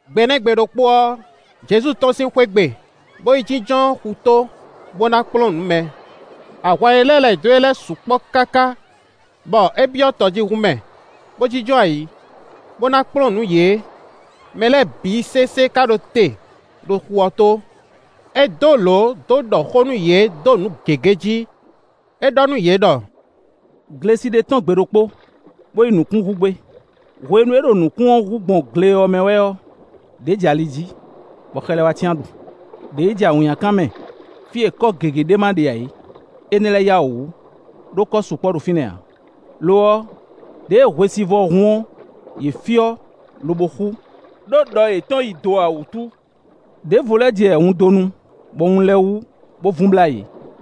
Gbe nɛ́ gbe ɖokpó ɔ́, Jezu tɔ́n sín xwé gbe, bó yi jínjɔ́n xutó, bó ná kplɔ́n nǔ mɛ. Ahwan e lɛ́ lɛ̌ dó e ɔ́ sukpɔ́ káká, bɔ é byɔ́ tɔjíhún mɛ, bó jínjɔ́n ayǐ, bó ná kplɔ́n nǔ yě; mɛ lɛ́ɛ bǐ sésé ka ɖo te ɖo xu ɔ́ tó. É dó lǒ dó ɖɔ xó nú yě dó nǔ gěgé jí; é ɖɔ nú yě ɖɔ: “Glesi ɖé tɔ́n gbe ɖokpó, bó yi nǔkún hú gbé. Hwenu e é ɖo nǔkún ɔ́ hú gbɔn gle ɔ́ mɛ wɛ ɔ́, ɖě jɛ ali jí, bɔ xɛ lɛ́ɛ wá cyán ɖu; ɖě yi jɛ awǐnnyakan mɛ fí e kɔ́ gěgé ɖé ma ɖe ǎ é; énɛ́ lɛ́ɛ yá wǔ wú, ɖó kɔ sukpɔ́ ɖo fínɛ́ ǎ; lo ɔ́, ɖěe hwesivɔ́ hun ɔ́, yě fyɔ́ lobo xú, ɖó ɖɔ yětɔn yi do ǎ wútu. Ɖěvo lɛ́ɛ jɛ wundonu, bɔ wun lɛ́ɛ wú, bó vun blá yě.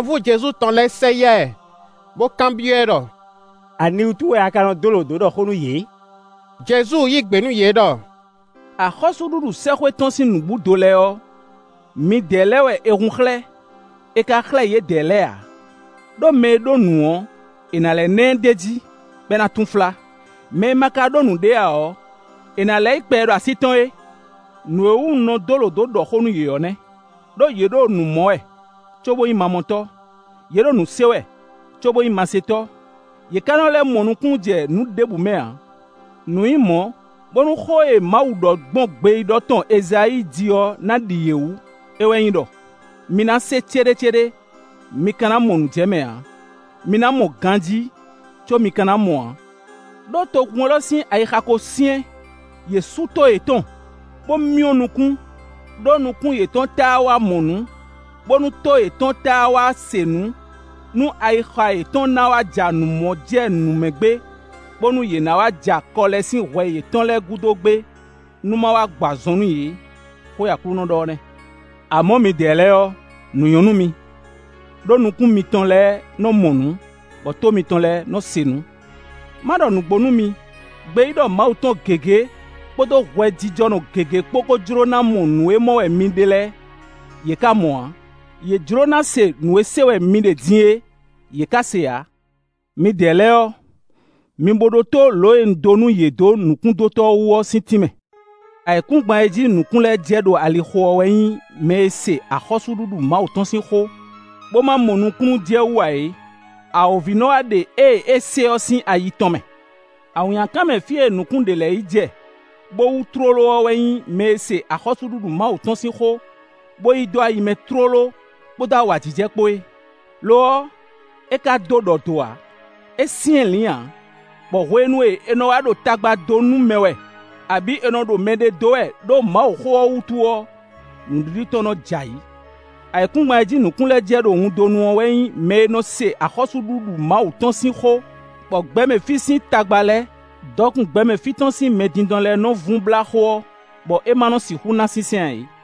Ahwanvú Jezu tɔn lɛ́ɛ sɛ yá ɛ, bó kanbyɔ́ ɛ ɖɔ: “Aniwútu wɛ a ka nɔ dó lǒ dó ɖɔ xó nú yě?” Jezu yí gbe nú yě ɖɔ: “Axɔ́súɖuɖu sɛ́xwé tɔn sín nǔbúdo lɛ́ɛ ɔ́, midɛɛ lɛ́ɛ wɛ è hun xlɛ́; è ka xlɛ́ yědɛɛ lɛ́ɛ ǎ. Ɖó mɛ e ɖó nǔ ɔ́, è nǎ lɛ́ ná ɛ d'é jí, bɔ é ná túnflá; mɛ e ma ka ɖó nǔɖé ǎ ɔ́, è nǎ lɛ́ yí kpɛ e ɖo así tɔn é. Nǔ e wú un nɔ dó lǒ dó ɖɔ xó nú yě ɔ́ nɛ́; ɖó yě ɖo nǔ mɔ wɛ, cóbó nyí mamɔtɔ́; yě ɖo nǔ se wɛ, cóbó nyí masetɔ́; yě ká nɔ lɛ́ mɔ nukúnnú jɛ nǔ ɖěbǔ mɛ ǎ. Nǔ nyí mɔ̌, bónú xó e Mawu ɖɔ gbɔn gbeyíɖɔ tɔn Ezayíi jí ɔ́ ná ɖi yě wú; é wɛ nyí ɖɔ: ‘Mi ná se céɖécéɖé, mi ka ná mɔ nǔ jɛ mɛ ǎ; mi ná mɔ ganjí, có mi ka ná mɔ ǎ. Ɖó togun élɔ́ sín ayixa ko syɛ́n; yě sú tó yětɔn, bó myɔ́ nukún, ɖó nukún yětɔn táá wá mɔ nǔ, bónú tó yětɔn táá wá se nǔ, nú ayixa yětɔn ná wá ja nǔ mɔ jɛ nǔ mɛ gbé, bónú yě ná wá ja kɔ lɛ́ sín hwɛ yětɔn lɛ́ɛ gúdo gbé, nú ma wá gbɔ azɔn nú yě. Xó e Aklúnɔ ɖɔ ɔ́ nɛ́.’ “Amɔ̌, midɛɛ lɛ́ɛ ɔ́, nǔ nyɔ́ nú mi, ɖó nukún mitɔn lɛ́ɛ nɔ́ mɔ nǔ, bɔ tó mitɔn lɛ́ɛ nɔ́ se nǔ. Ma ɖɔ nǔgbó nú mi, gbeyíɖɔ Mawu tɔn gěgé kpódó hwɛjijɔnɔ gěgé kpó ko jló ná mɔ nǔ e mɔ wɛ mi ɖe lɛ́ɛ, yě ká mɔ ǎ; yě jló ná se nǔ e se wɛ mi ɖe din é, yě ká se ǎ.” “Midɛɛ lɛ́ɛ ɔ́, mi bo ɖótó lǒ e un dó nú yě dó nǔkúndótɔ́ wú ɔ́ sín tínmɛ. Ayǐkúngban e jí nǔkún lɛ́ɛ jɛ ɖo alixo ɔ́ wɛ nyí mɛ e se axɔ́súɖuɖu Mawu tɔn sín xó, bó ma mɔ nukúnnú jɛ wú ǎ é; awǒvi nɔ́ wá ɖe ée é se ɔ́ sín ayi tɔn mɛ. Awǐnnyakan mɛ fí e nǔkún ɖě lɛ́ɛ yi jɛ, bó wú tlóló ɔ́ wɛ nyí mɛ e se axɔ́súɖuɖu Mawu tɔn sín xó, bó yí dó ayi mɛ tlóló kpódó awǎjijɛ kpó é; lo ɔ́, é ka dó ɖɔ do ǎ; é syɛ́nlǐn ǎ, bɔ hwenu e è nɔ wá ɖo tagba dó nú mɛ wɛ, abǐ è nɔ ɖo mɛ ɖe dó wɛ ɖó Mawuxó ɔ́ wútu ɔ́, nǔɖiɖi tɔn nɔ́ jɛ ayǐ. Ayǐkúngban e jí nǔkún lɛ́ɛ jɛ ɖo wundonu ɔ́ wɛ nyí mɛ e nɔ se axɔ́súɖuɖu Mawu tɔn sín xó, bɔ gbɛmɛ fí sín tagba lɛ́ɛ, dɔkun gbɛmɛ fí tɔn sín mɛdindɔn lɛ́ɛ nɔ́ vun blá xó ɔ́, bɔ é má nɔ́ sixú ná sínsɛ́n ǎ é.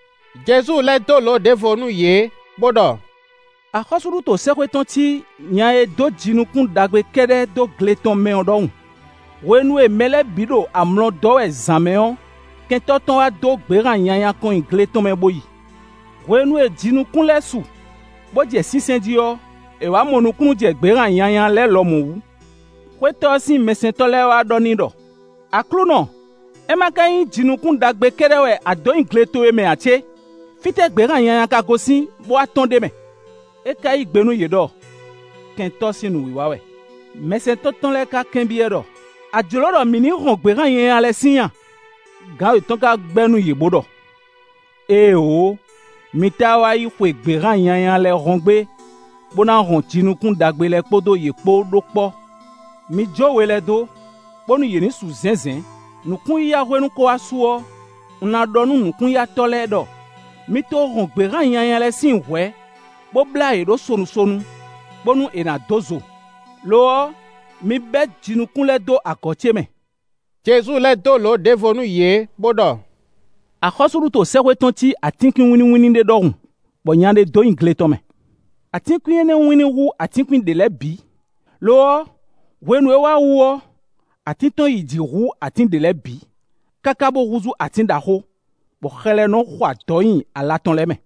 Jezu lɛ́ dó lǒ ɖěvo nú yě bó ɖɔ: “Axɔ́súɖuto sɛ́xwé tɔn cí nya e dó jinukún ɖagbe kɛ́ɖɛ́ dó gle tɔn mɛ ɔ́ ɖɔhun; hwenu e mɛ lɛ́ɛ bǐ ɖo amlɔ dɔ́ wɛ zǎn mɛ ɔ́, kɛntɔ́ tɔn wá dó gběhan nyanya kɔn nyi gle tɔn mɛ bó yi. Hwenu e jinukún lɛ́ɛ su, bó jɛ sínsɛ́n jí ɔ́, è wǎ mɔ nukúnnú jɛ gběhan nyanya lɛ́ɛ lɔmɔ̌ wú. Xwétɔ́ ɔ́ sín mɛsɛntɔ́ lɛ́ɛ wá ɖɔ n'i ɖɔ: ‘Aklúnɔ, é ma ka nyí jinukún ɖagbe kɛ́ɖɛ́ wɛ a dǒ nyi gle towe mɛ ǎ cé? Fítɛ́ gběhan nyanya ka gosín, bó wá tɔ́n ɖ'é mɛ?’ É ka yí gbe nú yě ɖɔ: ‘Kɛntɔ́ sín nǔwiwa wɛ.’ Mɛsɛntɔ́ tɔn lɛ́ɛ ka kanbyɔ́ ɛ ɖɔ: ‘A jlǒ ɖɔ mǐ ní hɔn gběhan nyanya lɛ́ɛ síin a?’ Gǎn yětɔn ka gbɛ́ nú yě bó ɖɔ: ‘Éeǒ! Mi táá wá yi xwe gběhan nyanya lɛ́ɛ hɔn gbé, bó ná hɔn jinukún ɖagbe lɛ́ɛ kpódó yě kpó ɖó kpɔ́. Mi jó we lɛ́ɛ dó, bónú yě ní su zɛ̌nzɛ̌n. Nǔkún-yiyahwenu ko wá su ɔ́, un ná ɖɔ nú nǔkún-yatɔ́ lɛ́ɛ ɖɔ: mi to hɔn gběhan nyanya lɛ́ɛ síin hwɛ̌, bó blá yě ɖó sonu sonu, bónú è nǎ dó zo; lo ɔ́, mi bɛ́ jinukún lɛ́ɛ dó agɔ̌ ce mɛ.’” Jezu lɛ́ dó lǒ ɖěvo nú yě bó ɖɔ: “Axɔ́súɖuto sɛ́xwé tɔn cí atínkwín wínníwínní ɖé ɖɔhun, bɔ nya ɖé dó nyi gle tɔn mɛ. Atínkwín énɛ́ ɔ́ wínní hú atínkwín ɖě lɛ́ɛ bǐ; lo ɔ́, hwenu e é wá wú ɔ́, atín tɔn yi jǐ hú atín ɖě lɛ́ɛ bǐ, káká bó húzú atín ɖaxó, bɔ xɛ lɛ́ɛ nɔ́ xo adɔ̌ nyi ala tɔn lɛ́ɛ mɛ.”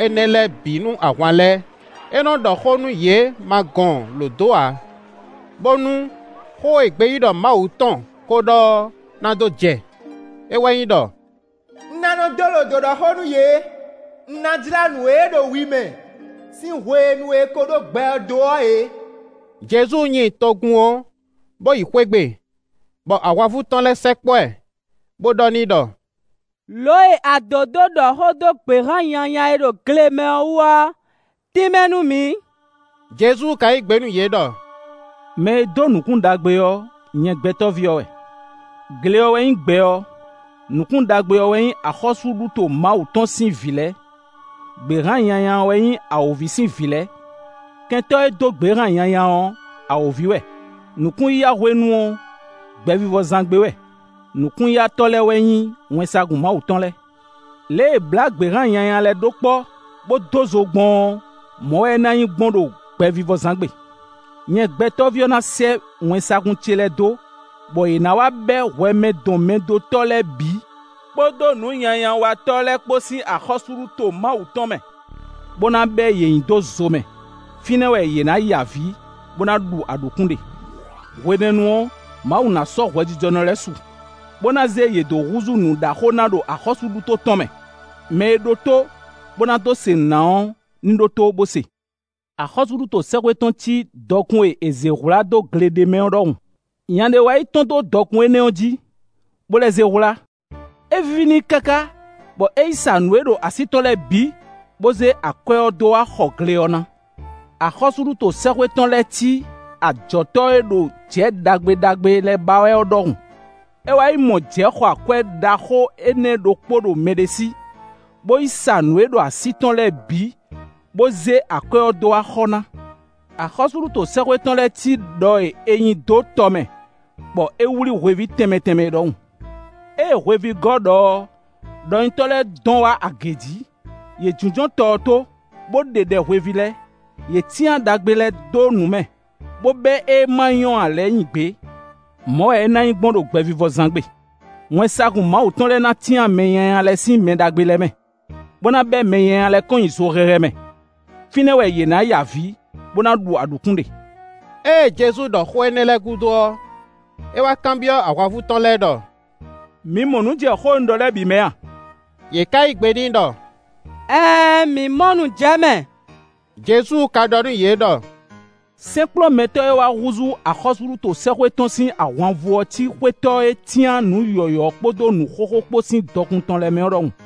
Lǒ wɛ Jezu nɔ dó ɖɔ xó énɛ́ lɛ́ɛ bǐ nú ahwan lɛ́ɛ. É nɔ́ ɖɔ xó nú yě ma gɔn lǒ dó ǎ; bónú xó e gbeyíɖɔ Mawu tɔn ko ɖɔ ɔ́ ná dó jɛ; é wɛ nyí ɖɔ: “Un ná nɔ́ dó lǒ dó ɖɔ xó nú yě; un ná jlá nǔ e ɖo wi mɛ sín hwenu e è ko ɖó gbɛ ɔ́ dó ɔ́ yě.” Jezu nyi togun ɔ́, bó yi xwé gbe, bɔ ahwanvú tɔn lɛ́ɛ sɛkpɔ́ ɛ, bó ɖɔ n'i ɖɔ: “Lǒ e a dǒ dó ɖɔ xó dó gběhan nyanya e ɖo gle mɛ ɔ́ wú ɔ́, tínmɛ nú mǐ.” Jezu ka yí gbe nú yě ɖɔ: “Mɛ e dó nǔkún ɖagbe ɔ́, nyɛ Gbɛtɔ́ví ɔ́ wɛ; gle ɔ́ wɛ nyí gbɛ ɔ́; nǔkún ɖagbe ɔ́ wɛ nyí axɔ́súɖuto Mawu tɔn sín vǐ lɛ́ɛ; gběhan nyanya ɔ́ wɛ nyí awǒvi sín vǐ lɛ́ɛ. Kɛntɔ́ e dó gběhan nyanya ɔ́, awǒvi wɛ; nǔkún-yiyahwenu ɔ́, gbɛvivɔzán gbe wɛ; nukún-yatɔ́ lɛ́ɛ wɛ nyí wɛnsagun Mawu tɔn lɛ́ɛ. Lě e è blá gběhan nyanya lɛ́ɛ ɖó kpɔ́, bó dó zo gbɔn ɔ́, mɔ̌ wɛ é ná nyí gbɔn ɖo gbɛvivɔzán gbe. Nyɛ Gbɛtɔ́ví ɔ́ ná sɛ́ wɛnsagun ce lɛ́ɛ dó, bɔ yě ná wá bɛ́ hwɛmɛdɔnmɛdótɔ́ lɛ́ɛ bǐ kpódó nǔnyanyawatɔ́ lɛ́ɛ kpó sín axɔ́súɖuto Mawu tɔn mɛ, bó ná bɛ́ yě nyi dó zo mɛ. Fínɛ́ wɛ yě ná ya avǐ, bó ná ɖu aɖǔkún ɖe. Hwenɛ́nu ɔ́, Mawu ná sɔ́ hwɛjijɔnɔ lɛ́ɛ su, bó ná zé yě dó húzú nǔɖaxó ná ɖo axɔ́súɖuto tɔn mɛ. Mɛ e ɖó tó bó ná dó se nǔ ná ɔ́ ní ɖótó bó se.” “Axɔ́súɖuto sɛ́xwé tɔn cí dɔkun e è zě hwlá dó gle ɖé mɛ ɔ́ ɖɔhun. Nya ɖé wá yi tɔ́n dó dɔkun énɛ́ ɔ́ jí, bó lɛ́ zé hwlá. É víví n'i káká, bɔ é yi sa nǔ e ɖo así tɔn lɛ́ɛ bǐ, bó zé akwɛ́ ɔ́ dó wá xɔ gle ɔ́ ná.” “Axɔ́súɖuto sɛ́xwé tɔn lɛ́ cí ajɔ̌tɔ́ e ɖo jɛ̌ ɖagbe ɖagbe lɛ́ɛ ba wɛ ɔ́ ɖɔhun. É wá yi mɔ jɛ̌ xɔ akwɛ́ ɖaxó énɛ́ ɖokpó ɖo mɛɖé sí, bó yi sa nǔ e ɖo así tɔn lɛ́ɛ bǐ, bó zé akwɛ́ ɔ́ dó wá xɔ ná.” “Axɔ́súɖuto sɛ́xwé tɔn lɛ́ cí ɖɔ e è nyi dó tɔ mɛ, bɔ é wlí hweví tɛnmɛ tɛnmɛ é ɖɔhun. Ée hweví gɔ́ ɖɔ ɔ́, ɖɔnyitɔ́ lɛ́ɛ dɔn wá agě jí; yě jínjɔ́n tɔ ɔ́ tó, bó ɖe ɖɛ hweví lɛ́ɛ; yě cyán ɖagbe lɛ́ɛ dó nǔ mɛ, bó bɛ́ ée má nyɔ́ ǎ lɛ́ɛ nyi gbě. Mɔ̌ wɛ é ná nyí gbɔn ɖo gbɛvivɔzán gbe. Wɛnsagun Mawu tɔn lɛ́ɛ ná cyán mɛ nyanya lɛ́ɛ sín mɛ ɖagbe lɛ́ɛ mɛ, bó ná bɛ́ mɛ nyanya lɛ́ɛ kɔn nyi zo hɛhɛ mɛ. Fínɛ́ wɛ yě ná ya avǐ, bó ná ɖu aɖǔkún ɖe.” Ée Jezu ɖɔ xó énɛ́ lɛ́ɛ gúdo ɔ́, é wá kanbyɔ́ ahwanvú tɔn lɛ́ɛ ɖɔ: “Mi mɔ nǔ jɛ xó e un ɖɔ lɛ́ɛ bǐ mɛ a?” Yě ká yí gbe n'i ɖɔ: “Ɛɛn, mǐ mɔ nǔ jɛ mɛ.” Jezu ka ɖɔ nú yě ɖɔ: “Sɛ́nkplɔ́nmɛtɔ́ e wá húzú axɔ́súɖuto sɛ́xwé tɔn sín ahwanvú ɔ́ cí xwétɔ́ e cyán nǔ yɔ̌yɔ́ kpódó nǔ xóxó kpó sín dɔkun tɔn lɛ́ɛ mɛ ɔ́ ɖɔhun.”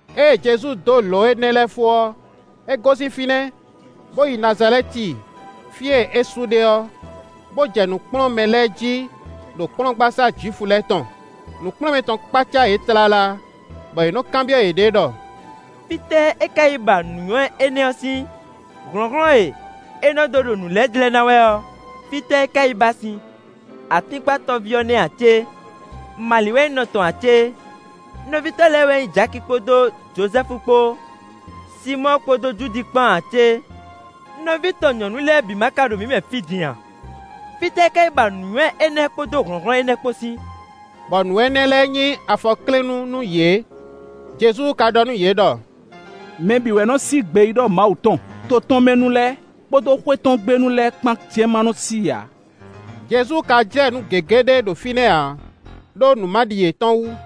Ée Jezu dó lǒ énɛ́ lɛ́ɛ fó ɔ́, é gosín fínɛ́, bó yi Nazalɛ́ti fí e é su ɖe ɔ́, bó jɛ nǔ kplɔ́n mɛ lɛ́ɛ jí ɖo kplɔ́ngbasá Jwifu lɛ́ɛ tɔn. Nǔkplɔ́nmɛ tɔn kpácá yě tlala, bɔ yě nɔ́ kanbyɔ́ yěɖée ɖɔ: “Fítɛ́ é ka yi ba nǔnywɛ́ énɛ́ ɔ́ sín? Hlɔ̌nhlɔ́n e é nɔ́ dó ɖo nǔ lɛ́ɛ jlɛ́ ná wɛ ɔ́, fítɛ́ é ka yi ba sín? Atínkpatɔ́ví ɔ́ nɛ́ ǎ cé? Mali wɛ nyí nɔ tɔn ǎ cé? Nɔví tɔn lɛ́ɛ wɛ nyí Jaki kpódó Jozɛ́fu kpó, Sinmɔ́ɔ kpó Judi kpán ǎ cé? Nɔví tɔn nyɔ̌nu lɛ́ɛ bǐ ma ka ɖo mǐ mɛ fí din a? Fítɛ́ é ka yi ba nǔnywɛ́ énɛ́ kpódó hlɔ̌nhlɔ́n énɛ́ kpó sín?” Bɔ nǔ énɛ́ lɛ́ɛ nyí afɔklɛ́nnú nú yě. Jezu ka ɖɔ nú yě ɖɔ: “Mɛ bǐ wɛ nɔ́ sí gbeyíɖɔ Mawu tɔn; to tɔn mɛ nu lɛ́ɛ, kpódó xwé tɔn gbe nu lɛ́ɛ kpán jɛ́n ma nɔ́ sí i ǎ.” Jezu ka jlɛ́ nǔ gěgé ɖé ɖo fínɛ́ ǎ, ɖó nǔmaɖi yětɔn wú.